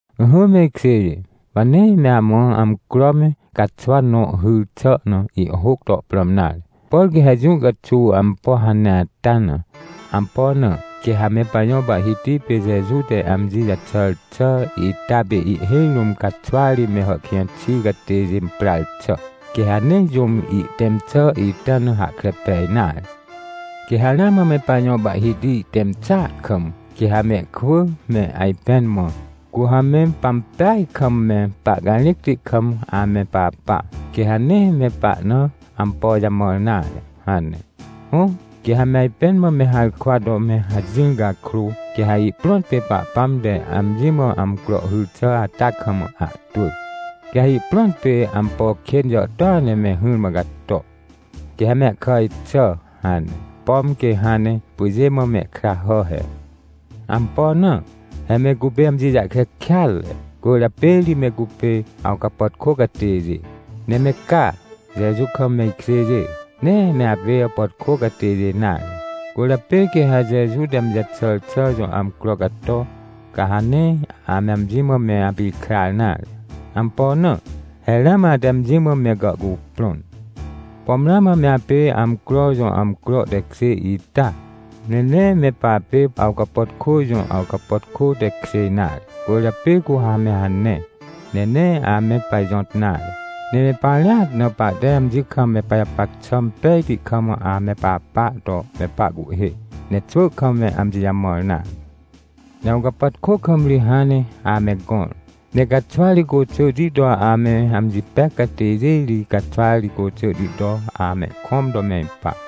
Ỹhỹ me ikjêjê, wa nee me amã amcro me caxwa nõ hyr xà na ihhôc to prãm nare. Por quê ha jũ caxuw ampo hane ata na. Ampo na? Quê ha me pajõ Pahhiti pê Jeju te amji jaxàr xà ita pê ihhêj rũm caxwa ri me hàhkĩj xi catêjê imprar xà. Quê ha nee jũm ihtẽm xà ita na hahkre pej nare. Quê ha ramã me pajõ Pahhiti ihtẽm xàa kam, quê ha mehkwỳ me ajpẽn mã: — Cu ha me pampeaj kam me pahcarĩcti kam ame papa, quê ha nee me pahna ampo jamãr nare — hane. Hõ, quê ha me ajpẽn mã me harkwa to me hajỹr cakrô, quê ha ihprõt pê Pahpãm te amji mã amcro hyr xà ata kam ahtwỳ. Quê ha ihprõt pê ampo kên jàhtôa ne me hỹrmã cato. Quê ha mehkàj xà hane, pom quê hãn ne pyjê mã ihkra hà he. Ampo na? He me cupê amji jahkre kêatre, cwỳrjapê ri me cupê awcapàtkô catêjê. Ne me ca, Jeju kam me ikjêjê, nee me apê awcapàtkô catêjê nare. Cwỳrjapê quê ha Jeju te amji jaxàr xà jõ amcro cato, ca ha nee ame amji mã me apikrar nare. Ampo na? He ramã ate amji mã me gàhcuprõn. Pom ramã me apê amcro jõ amcro tekjê ita? Ne nee me papê awcapàtkô jõ awcapàtkô tekjê nare. Cwỳrjapê cu ha me hane, ne nee ame pajõt nare, ne me parĩat na pahte amji kam me pajapac xà impejti kam ame papa to me pahcuhhê, ne xwỳ kam me amji jamãr nare. Ne awcapàtkô kam ri hãn ne ame gõr. Ne caxwa ri côxỳhti to ame amji pec catêjê ri caxwari côxỳhti to amehkõm to me ipa.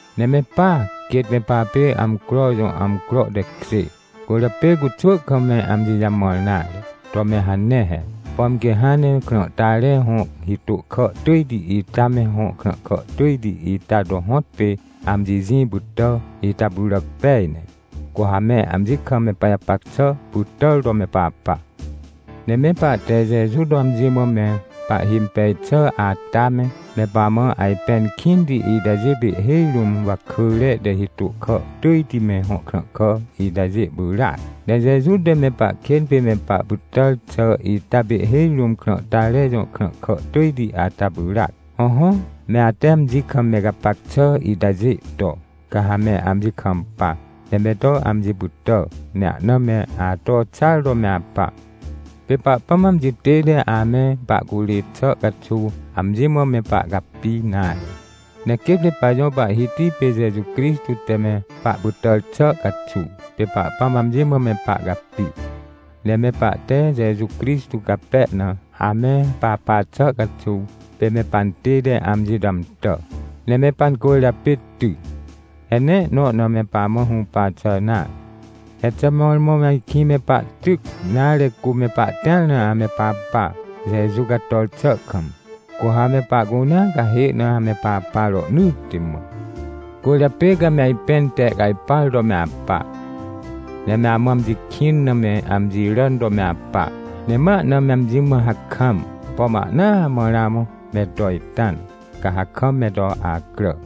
Ne me pa, quêt me papê amcro jõ amcro tekjê, cwỳrjapê cu xwỳ kam me amji jamãr nare to me hane he. Pom quê hãn ne krãhtare hõ hitô kà tỳjti ita me hõ krãhkà tỳjti ita to hõtpê amji jĩ pytà ita pyràc pej ne, cu ha me amji kam me pajapac xà pytàr to me papa. Ne me pahte Jeju to amji mã me pahhimpej xà ata me, me pamã ajpẽn kĩnti itajê pê ihhêj rũm wakỳre te hitô kà tỳjti me hõ krãhkà itajê pyràac. Ne Jeju te me pahkên pê me pahpytàr xà ita pê ihhêj rũm krãhtare jõ ihkrãhkà tỳjti ata pyràac. Hõhõ, me ate amji kam me gapac xà itajê to, ca ha me amji kampa, ne me to amji pytà, ne ahna me ato xar to me apa. Pê Pahpãm amji tête ame pahcurê xà caxuw amji mã me pahcapi nare. Ne quêt me pajõ Pahhiti pê Jeju Crixtô te me pahpytàr xà caxuw, pê Pahpãm amji mã me pahcapi. Ne me pahte Jeju Crixtô cape na ame papa xà caxuw, pê me pantête amji to amtà, ne me pancwỳrjapê ty. He nee ihnõ na me pamã hũpa xà nare. He xà mõrmõ ajkĩ me pahtyc, nare, cu me pahtĩar na ame papa, Jeju cator xà kam, cu ha me pahcunea cahê na ame papa rohnỳtti mã. Cwỳrjapê ca me ajpẽn tehcajpar to me apa, ne me amã amji kĩn na me amji ràn to me apa. Ne ma ahna me amji mã hakam. Pom ahnaa mã ramã me to ita na, ca ha kam me to acrà.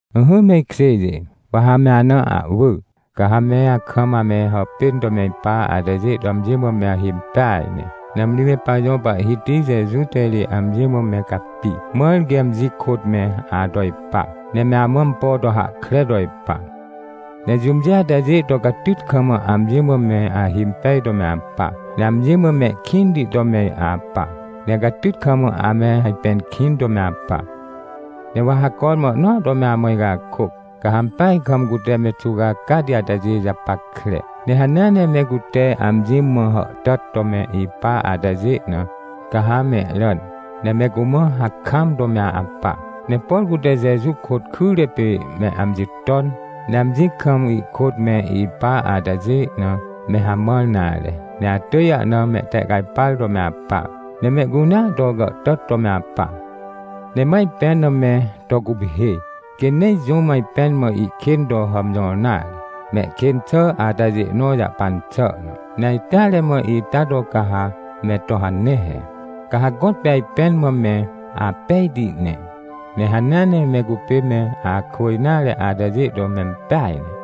Ỹhỹ me ikjêjê, wa ha me ana ahwỳ, ca ha me akam ame hàpên to me ipa atajê to amji mã me ahimpeaj ne. Nãmri me pajõ Pahhiti Jeju te ri amji mã me capi, mãr quê amji kôt me ato ipa, ne me amã ampo to hahkre to ipa. Ne jũmjê atajê to catyt kam amji mã me ahimpej to me apa, ne amji mã mehkĩnti to me apa, ne catyt kam ame ajpẽn kĩn to me apa. Ne wa ha cormã ihnõa to me amã icakôc. Ca ha ampeaj kam cute me xuwcacati atajê japackre. Ne hanea ne me cute amji mã hàhtàt to me ipa atajê na, ca ha mehràn, ne me cumã hakam to me apa. Ne por cute Jeju kôt kyre pê me amji ton, ne amjĩ kam ihkôt me ipa atajê na, me hamãr nare, ne atỳj ahna mehtehcajpar to me apa. Ne mehcunea to gàhtàt to me apa. Ne ma ajpẽn na me to guphê, quê nee jũm ajpẽn mã ihkên to hàmjõr nare, mehkên xà atajê nõ jahpan xà na. Ne ajteare mã ita to ca ha me to hane he. Ca ha gõtpê ajpẽn mã me apejti ne, ne hanea ne me cupê me akwỳ nare atajê to mempeaj ne.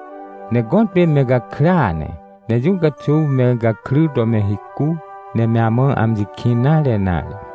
Ne gõtpê me gakrya ne, ne jũ caxuw me gakry to me hicu ne me amã amji kĩn nare nare.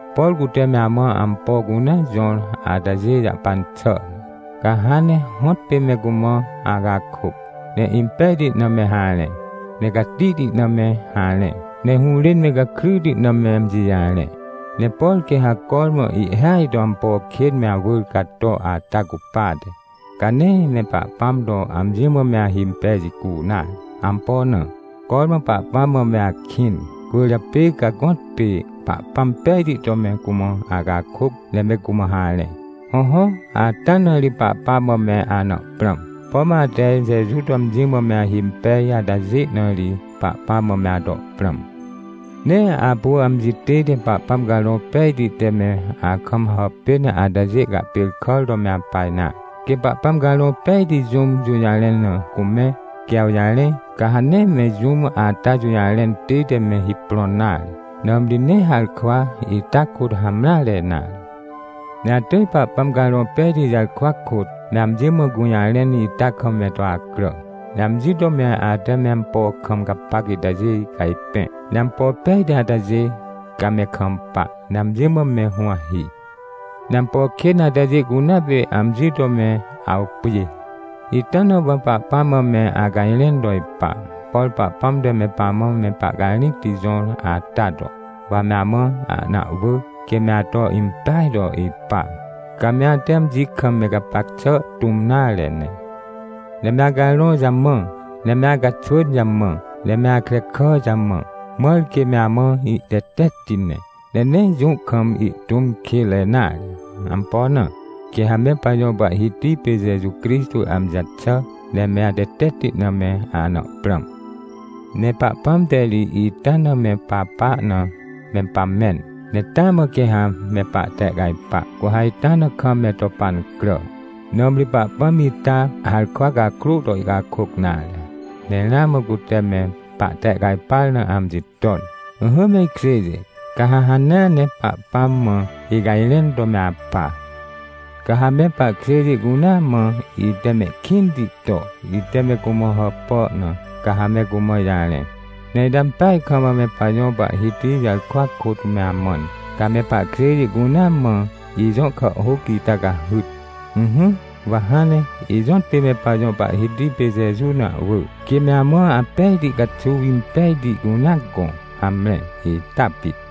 Por cute me amã ampo cunea jõr atajê jahpan xà na, ca hãn ne hõtpê me cumã acakôc, ne impejti na me harẽ, ne catihti na me harẽ, ne hũrên me gakryti na me amji jarẽ. Ne por quê ha cormã ihhêaj to ampo kên me awỳr cato ata cupate, ca nee me Pahpãm to amji mã me ahimpej jicu nare. Ampo na? Cormã Pahpãm mã me akĩn, cwỳrjapê ca gõtpê Pahpãm pejti to me cumã acakôc ne me cumã harẽ. Hõhõ, ata na ri Pahpãm mã me ana prãm. Pom ate Jeju to amji mã me ahimpej atajê na ri Pahpãm mã me ato prãm. Nee apu amji tête Pahpãm Carõ Pejti te me akam hàpên atajê cahpêrkàr to me apa nare. Quê Pahpãm Carõ Pejti jũm jũjarẽn na cumẽ, quê awjarẽ, ca ha nee me jũm ata jũjarẽn tête me hiprõn nare, nãmri nee harkwa ita kôt hamreare nare. Ne atỳj Pahpãm Carõ Pejti jarkwa kôt me amji mã gũjarẽn ita kam me to acrà. Ne amji to me ate me ampo kam gapac itajê cajpẽ, ne ampo pejti atajê, ca me kampa, ne amji mã me huwahi. Ne ampo kên atajê cunea pê amji to me awpjê. Ita na wa Pahpãm mã me acajrẽn to ipa, por Pahpãm te me pamã me pahcarĩcti jõr ata to, wa me amã ahna ahwỳ, quê me ato impeaj to ipa, ca me ate amji kam me gapac xà tũm nare ne, ne me acarõ jamã, ne me acaxwỳn jamã, ne me akrekà jamã, mãr quê me amã ihtetetti ne. Ne nee jũ kam ihtũm kênre nare. Ampo na? Quê ha me pajõ Pahhiti pê Jeju Crixtô amji jaxà ne me atetetti na me ana prãm. Ne Pahpãm te ri ita na me papa na, me pamẽn, ne taa mã quê ha me pahtehcajpa, cu ha ita na kam me to pancrà. Nãmri Pahpãm ita harkwa cakrô to ihcakôc nare. Ne ramã cute me pahtehcajpar na amji ton. Ỹhỹ me ikjêjê, ca ha hanea ne Pahpãm mã icajrẽn to me apa. Ca ha me pahkjêjê cunea mã ite mehkĩnti to ite me cumã hàpà na, ca ha me cumã ijarẽ. Ne ite ampeaj kam me pajõ Pahhiti jarkwa kôt me amãn, ca me pahkjêjê cunea mã ijõ kàhhôc ita cahyt. Ỹhỹ, wa hãn ne ijõtpê me pajõ Pahhiti pê Jeju na ahwỳ, quê me amã apejti caxuw impejti cunea gõ. Hamre, ita pit.